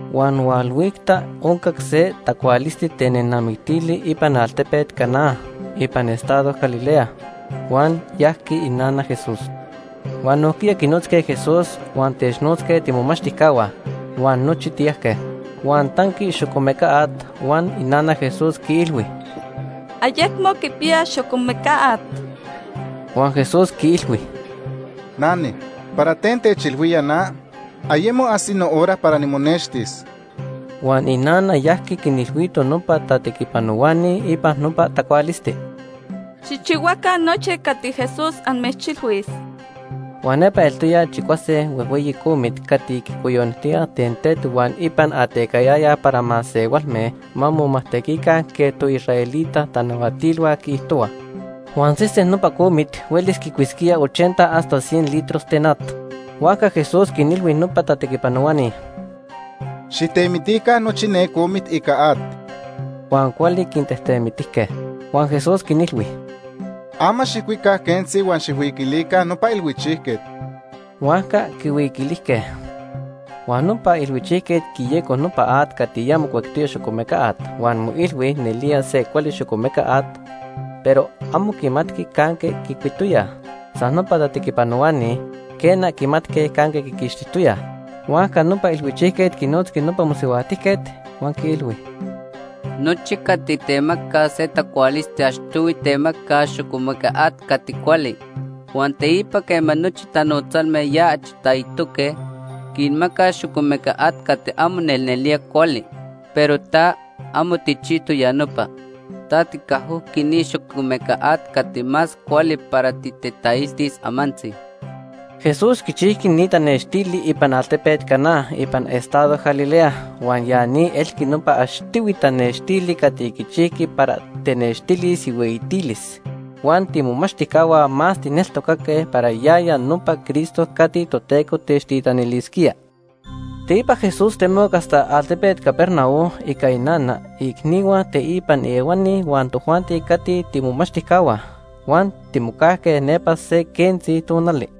Huan hualhuicta oncac se tacualisti ten nenamictili ipan altepet Caná ipan estado Galilea, huan yajqui inana Jesús. Huan nojquiya quinotzque Jesús huan technotzque tiimomachtijcahua, huan nochi tiyajque. Huan tanqui xocomeca at huan inana Jesús quiilhui: ―Ayecmo quipiyaj xocomeca at. Huan Jesús quiilhui: ―Nane, ¿para ten techilhuía na? Ayemo ajsi nohora para nimonextis. Huan inana yajqui quinilhuito nopa tatequipanohuani ipan nopa tacualisti: ―Xijchihuaca nochi cati Jesús amechilhuis. Huan nepa eltoya chicuase huejhueyi comit cati quicoyonijtoyaj ten tet huan ipan atecayayaj para masehualme ma momajtequica quej toisraelita tanahuatilhua quiijtohuaj. Huan sesen nopa comit huelis quicuisquía ochenta hasta cien litros ten at. Huajca Jesús quinilhui nopa tatequipanohuani: ―Xijtemitica nochi ne comit ica at. Huan cuali quintejtemitijque. Huan Jesús quinilhui: ―Ama xijcuica quentzi huan xijhuiquilica nopa ilhuichijquet. Huajca quihuiquilijque. Huan nopa ilhuichijquet quiyeco nopa at cati ya mocuectoya xocomeca at huan moilhui nelía se cuali xocomeca at, pero amo quimatqui canque quicuitoyaj. San nopa tatequipanohuani, quena, quimatque canque quiquixtijtoyaj. Huajca nopa ilhuichijquet quinotzqui nopa mosihuajtijquet, huan quiilhui: ―Nochi cati temacaj se tacualisti achtohui temacaj xocomeca at cati cuali, huan teipa quema nochi tanotzalme ya achi taitoque, quinmacaj xocomeca at cati amo nelnelía cuali. Pero ta, amo tijchijtoc ya nopa. Ta ticajojqui ni xocomeca at cati más cuali para titetailtis amantzi. Jesús quichijqui ni tanextili ipan altepet Caná ipan estado Galilea. Huan ya ni elqui nopa achtohui tanextili cati quichijqui para technextilis ihueyitilis. Huan tiimomachtijcahua más tijneltocaque para yaya nopa Cristo cati Toteco techtitanilisquía. Teipa Jesús temoc hasta altepet Capernaum ica inana, iicnihua teipan ehuani huan tojuanti cati tiimomachtijcahua. Huan timocajque nepa se quentzi tonali.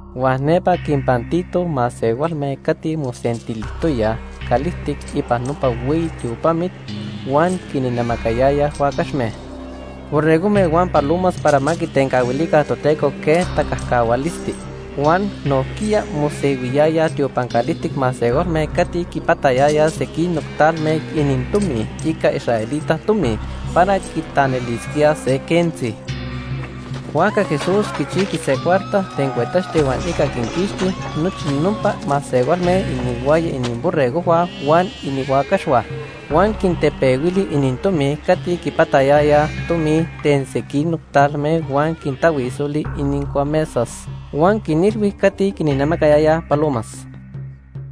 Huan nepa quinpantito masehualme cati mosentilijtoyaj calijtic ipan nopa hueyi tiopamit huan quinnamacayayaj huacaxme, borregojme huan palomas para ma quitencahuilica Toteco quej tacajcahualisti. Huan nojquiya mosehuiyayaj tiopan calijtic masehualme cati quipatayayaj sequinoc talme inintomi ica israelita tomi para quitanilisquíaj se quentzi. Huajca Jesús quichijqui se cuarta ten cuetaxti huan ica quinquixti nochi nopa masehualme inihuaya ininborregojhua huan inihuacaxhua. Huan quintepehuili inintomi cati quipatayayaj tomi ten sequinoc talme huan quintahuisoli inincuamesas. Huan quinilhui cati quinnamacayayaj palomas: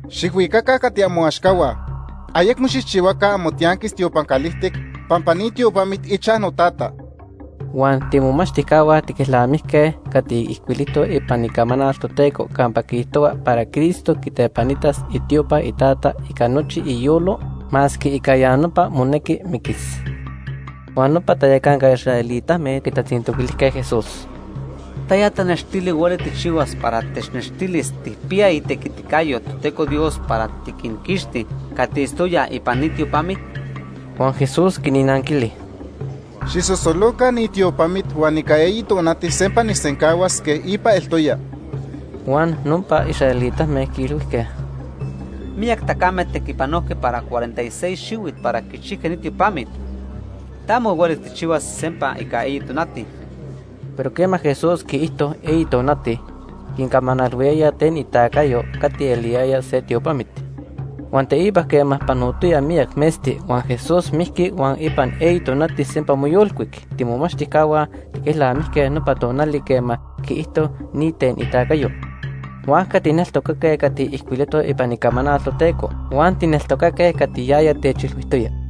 ―Xijhuicaca cati amoaxcahua. Ayecmo xijchihuaca amotianquis tiopan calijtic pampa ni tiopamit ichaj noTata. Huan tiimomachtijcahua tiquelnamijque cati ijcuilijtoc ipan Icamanal Toteco campa quiijtohua para Cristo quitepanitas itiopa iTata ica nochi iyolo, masque ica ya nopa monequi miquis. Huan nopa tayacanca israelitame nepa quitatzintoquilijque Jesús: ―¿Taya tanextili hueli tijchihuas para technextilis tijpiya itequiticayo Toteco Dios para tiquinquixti cati itztoyaj ipan ni tiopamit? Huan Jesús quinnanquili: ―Xijsosoloca ni tiopamit huan ica eyi tonati sempa nijsencahuas quej ipa eltoya. Huan nopa israelitame quiilhuijque: ―Miyac tacame tequipanojque para cuarenta y seis xihuit para quichijque ni tiopamit; ta amo huelis tijchihuas sempa ica eyi tonati. Pero quema Jesús quiijto eyi tonati, quincamanalhuiyaya ten itacayo cati eliyaya se tiopamit. Huan teipa quema panotoya miyac metzti huan Jesús mijqui huan ipan eyi tonati sempa moyolcuic, tiimomachtijcahua tiquelnamijque nopa tonali quema quiijto ni ten itacayo. Huajca tijneltocaque cati ijcuilijtoc ipan Icamanal Toteco huan tijneltocaque cati yaya techilhuijtoya.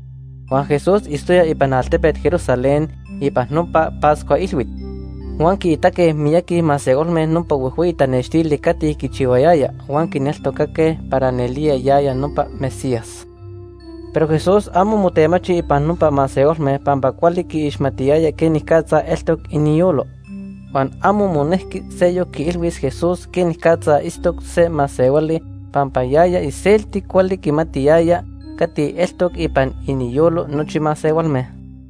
Huan Jesús itztoya ipan altepet Jerusalén ipan nopa Pascua Ilhuit. Huan quiitaque miyaqui masehualme nopa huejhueyi tanextili cati quichihuayaya huan quineltocaque para nelía yaya nopa Mesías. Pero Jesús amo motemachi ipan nopa masehualme pampa cuali quiixmatiyaya quenicatza eltoc iniyolo. Huan amo monejqui seyoc quiilhuis Jesús quenicatza itztoc se masehuali pampa yaya iselti cuali quimatiyaya cati eltoc ipan iniyolo nochi masehualme.